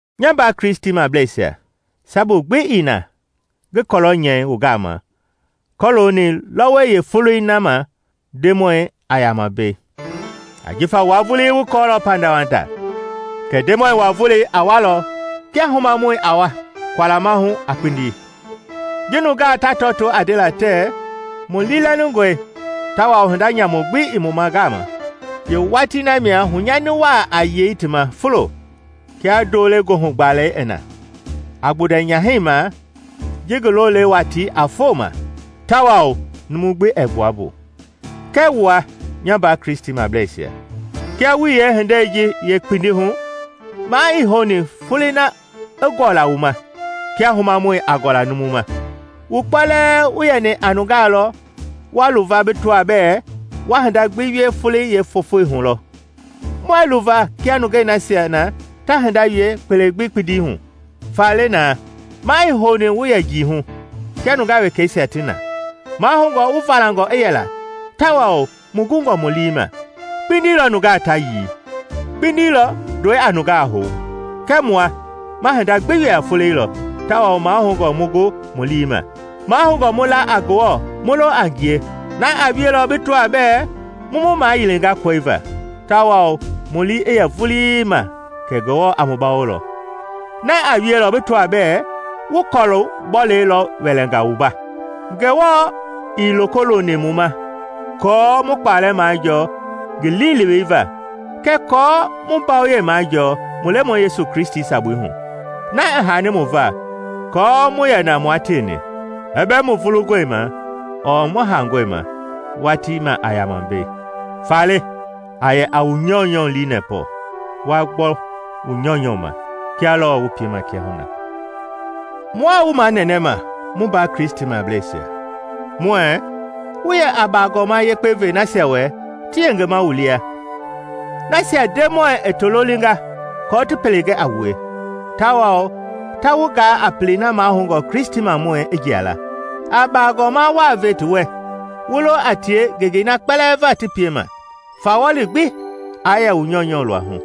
Nya mbaa Kristimableisia, sabu gbi ii na ngi kɔlɔ nyɛi wu gama kɔɔlooni lɔwɔi yeefoloi na ma Ndemɔi a yama mbei. Ajifa wua vulii wu kɔɔlɔ pandawanda kɛ Ndemɔi wa-Volei a walɔ kia humamɔi a wa kualama hu a kpindi. Ji nungaa ta tɔɔto a ndela tɛɛ, “Mu liilɛlingɔe tawao hinda nyamu gbi ii mu gama,” yeewatii na mia hunyani waa a yei ti ma fulo kia ndoo le goohugbalɛi i na, a gbundɛ nyahɛi ma ji ngi lo le watii a fo ma, tawao numu gbi ɛɛ gbua mbu. Kɛɛ wua, nya mbaa Kristimableisia, kia wuii yeehindei ji yeekpindi hu, maa ii houni folei na i gɔla wu ma kia humamɔi a gɔla numu ma. Wu kpɛlɛɛ wu yɛni a nungaa lɔ wa luva bi tɔa bɛɛ wa hinda gbi wie folei yeefofoi hu lɔ. Muɛɛ luva kia nungei nasia na ta hinda wie kpele gbi kpindi hu. Faale na, maa ii houni mu yɛ njii hu, kia nungaa wekɛisia ti na; mahoungɔ mu valangɔ i yɛla tawao mu gungɔ mu lii ma. Kpindi lɔ nungaa ta yii; kpindi lɔ ndɔi a nungaa hou. Kɛɛ mua ma hinda gbi wie a folei lɔ tawao mahoungɔ mu gu mu lii ma. Mahoungɔ mu la a Ngewɔ mu lo a ngie na a wielɔ bi tɔa bɛɛ mu mu mayilinga kɔi va, tawao mu lii i yɛ vulii ma kɛ Ngewɔ a mu bawolɔ: na a wielɔ bi tɔa bɛɛ wu kɔlu-bɔlɛi lɔ wɛlɛnga wumba. Ngewɔ ii loko looni mu ma aako mu kpalɛ majɔɔ ngi liilewei va kɛɛ aako mu mbawoyei maajɔɔ mu Lemɔi Yesu Kristi sabui hu, na i haani mu va kɔɔ mu yɛna mua tieni, i bɛ mu vulungɔi ma ɔɔ mu haangɔi ma watii ma a yama mbei. Faale, a yɛ a wu nyɔunyɔ lii nɛpɔ, wa gbɔ wu nyɔunyɔ ma, kia lɔɔ wu piema kiahuna. Mua wu manɛnɛma, mu mbaa Kristimableisia, muɛɛ wu yɛ a baagɔma yekpe ve nasia wɛ ti yengema wu lia, nasia Ndemɔi i ti lolinga kɔɔ ti pele gɛ a wue, tawao ta wu gaa a pelei na mahoungɔ Kristimamɔi i jia la. A baagɔma waa ve ti wɛ, wu lo a tie ngengei na kpɛlɛɛ va ti piema. Fawɔli gbi aa yɛ wu nyɔunyɔ luahu.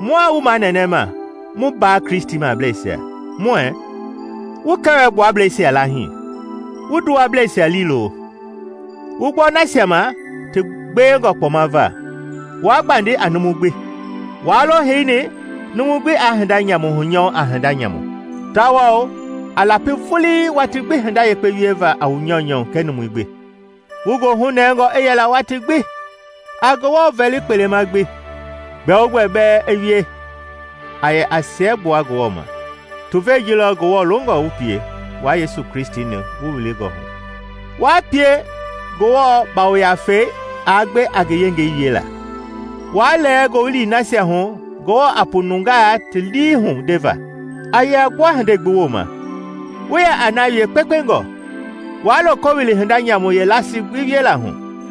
Mua wu manɛnɛma, mu mbaa Kristimableisia, muɛɛ wu kɛwɛ-gbuablɛisia laahii, wu nduwableisia liilo, wu gbɔ nasia ma ti gbewengɔ kpɔma va, waa gbandi a numu gbi. Waa lo heini numu gbi aa hinda nyamu hunyɔɔ a hinda nyamu, tawao a lapi vulii watii gbi hinda yekpe wieva a wu nyɔunyɔ kɛɛ numui gbi. Wu goohu nɛngɔ i yɛla watii gbi, a Ngewɔ vɛli kpema gbi, gbɛogbɛ bɛ i wie a yɛ a siɛgbua Ngewɔ ma. Tuvei ji lɔ Ngewɔ longɔ wu pie wua Yesu Kristi-ni wu wilingɔ hu. Waa pie Ngewɔ Yafei aa gbe a ngi yengei wiela; Waa lɛɛ Ngowili nasia hu Ngewɔ a pu nungaa ti lii hu ndeva. A yɛ a gbua hindei gbi wooma, wu yɛ a na wie kpekpengɔ, waa loko wili hinda nyamu yeelasii gbi wiela hu.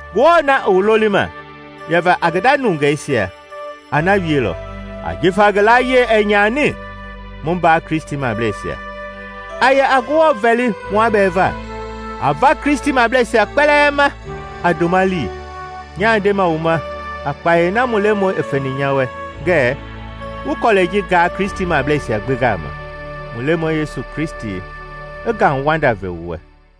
Ngewɔ na i wu lolima yɛva a ngi nda nungeisia a na wielɔ, ajifa ngi layie ɛɛ nyani. Mu mbaa Kristimableisia, a yɛ a Ngewɔ vɛli mua bɛɛ va. A va Kristimableisia kpɛlɛɛ ma a ndoma lii. Nyaa ndema wu ma a kpayei na mu Lemɔi i feni nya wɛ ngɛɛ wu kɔlɛi ji gaa Kristimableisia gbi gama. Mu Lemɔi Yesu Kristi i ngauwanda ve wu wɛ.